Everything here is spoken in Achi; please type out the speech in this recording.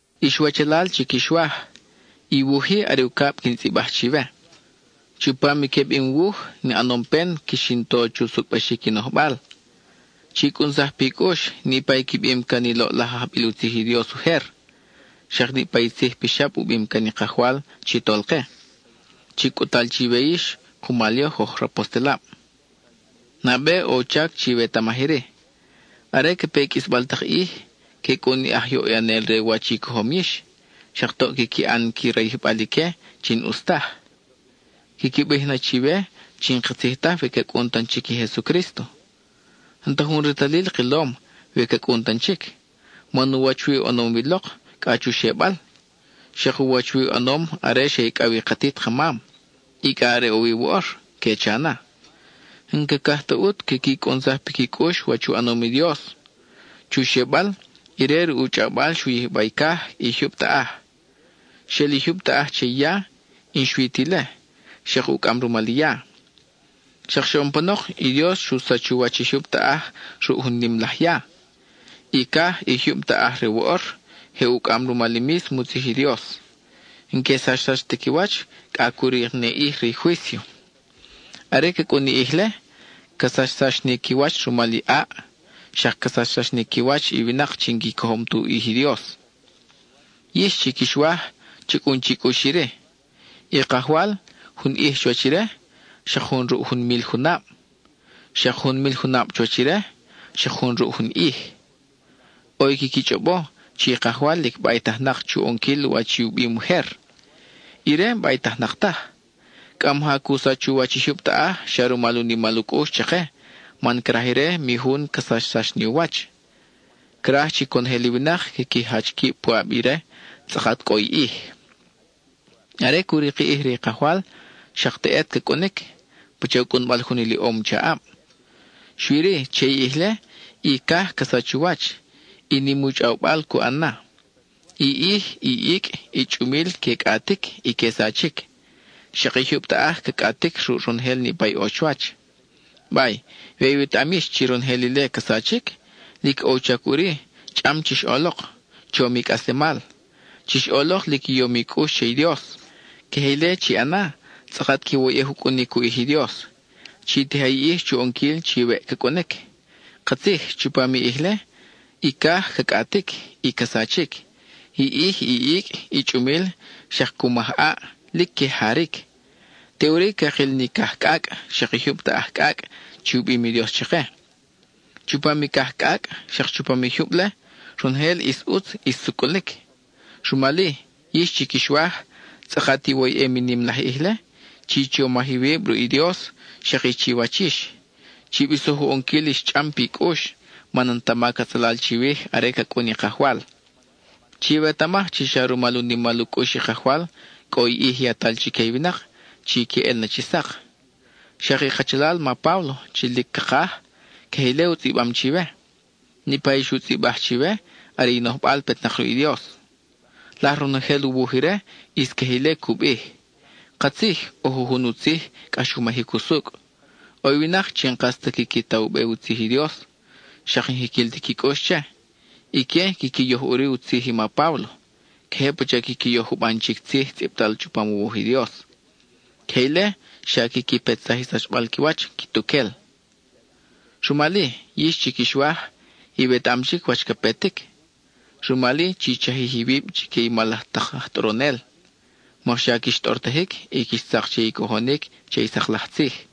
Ix wachalal chi quix waj, i wuj-i are ucab quin tzʼibaj chiwe. Chupam i queb in wuj, in ʼanom pen quix in to chu sucʼbaxic i nojbal. Chi cʼunsaj pi cʼux niʼpa i qui bim can i loʼlaj ajbil u tzij i Dios ujer, xak niʼpa i tzij pixab u bim can i Kajwal chi Tolke, chi cʼut-tal chiwe yix kumal yoj oj rapostelab. Nabe ʼo u chac chiwetamaj iri: are ca pe i qʼuisbal tak ʼij, que cʼun i aj yoʼyanel re wach i cojom yix, xak toʼ quiqui ʼan qui rayijbal ique chi n-ʼus taj. Quiqui bij na chiwe chi n-katzij taj we ca cʼun tan chic i Jesucrísto. “N-ta jun retalil kilom we ca cʼun tan chic, man u wach wi u ʼanom wi lok cʼa chu xebal. Xak u wach wi u ʼanom are xe icʼaw wi i katit ka mam, y cʼa are ʼo wi woʼor,” que cha na. N-cacaj ta ʼut quiqui cʼunsaj piqui cʼux wach u ʼanom i Dios; chu xebal, ire ruʼ u chʼawbal xu yijba i caj, i jyub taʼaj. Xel i jyub taʼaj che i ya, y n-xui ta ile, xak ucʼam rumal i ya. Xak xoʼon panok, i Dios xu sach u wach i jyub taʼaj ruʼ jun nim laj ya. I caj, i jyub taʼaj re woʼor, je ucʼam rumal i mísmo u tzij i Dios; n-que sachsax ta qui wach cʼa cu rik ni ʼij re i juício. Are ca cʼun i ʼij-le, ca sachsax ni qui wach rumal i ʼaʼ, xak ca sachsax ni qui wach i winak chi n-qui cojom tu ʼij i Dios. Yix, chi quix waj, cha cʼun chi cʼux iri: i Kajwal, jun ʼij chuwach ire, xak jun ruʼ jun mil junab; xak jun mil junab chuwach ire, xak jun ruʼ jun ʼij. ʼO i quiqui chʼobo chi i Kajwal lic baytajnak chu ʼonquil wach i u bim ujer; ire n-baytajnak taj. Cʼa maja cu sach u wach i jyub taʼaj xa rumal u nimal u cʼux chake man craj ire mi jun ca sachsax ni u wach: craj chi conojel i winak quiqui jach quib puʼab ire tzʼakat cʼo i ʼij. Are cu rik i ʼij re i Kajwal, xak teʼet ca cʼunic, pasha u cʼunbal jun iliʼom chaʼab. Xui-ri, che i ʼij-le, i caj ca sach u wach, y nim u chʼawbal cu ʼan na. I ʼij, i icʼ, i chʼumil que cʼatic y que sachic; xak i jyub taʼaj ca cʼatic ruʼ ronojel niʼpa i ʼo chuwach. Bay, we iwetaʼam yix chi ronojel ile ca sachic, lic ʼo u chac ʼuri chʼam chix ʼolok, chom i cʼaslemal; chix ʼolok lic i yom i cʼux che i Dios. Queje ile chi ʼana, tzʼakat quiwoyʼej u cʼunic u ʼij i Dios. Chi tija i ʼij chu ʼonquil chi weʼ ca cʼunic. Katzij, chupam i ʼij-le i caj ca cʼatic y ca sachic. I ʼij, i icʼ, i chʼumil xak cu maj ʼaʼ, lic que jaric. Teʼuri cakil ni caj cʼacʼ, xak i jyub taʼaj cʼacʼ chi u bim i Dios chake. Chupam i caj cʼacʼ xak chupam i jyub-le, ronojel ʼis ʼutz ʼis sucʼulic. Rumal-i, yix chi quix waj, tzʼakat iwoyʼem i nim laj ʼij-le, chi chomaj iwib ruʼ i Dios xak i chiwach yix; chi bisoj u ʼonquil ix chʼam pi cʼux, man n-ta mac atzalal chiwij are ca cʼun i Kajwal. Chiwetamaj chi xa rumal u nimal u cʼux i Kajwal, cʼo i ʼij yatal chique i winak chi que, ʼel na chi sak. Xak i kachalal ma Páblo chi lic cakaj, queje ile u tzʼibam chiwe. Niʼpa i xu tzʼibaj chiwe are i nojbal petnak ruʼ i Dios. Laj ronojel u wuj ire, ʼis queje ile cu bij. Katzij, ʼo jujun u tzij, cʼax u majic usucʼ. ʼO i winak chi n-kas ta quiqui ta u be u tzij i Dios, xak n-jiquil ti qui cʼux che; ique quiqui yoj ʼuri u tzij i ma Páblo, queje pacha quiqui yoj juban chic tzij tzʼibtal chupam u wuj i Dios. Queje ile xa quiqui petsaj i sachbal qui wach quituquel. Rumal-i, yix chi quix waj, iwetaʼam chic wach ca petic; rumal-i chi chajij iwib chique i mal laj tak aj tʼoronel, mokxa quix tʼortajic y quix tzak che i cojonic che i sak laj tzij.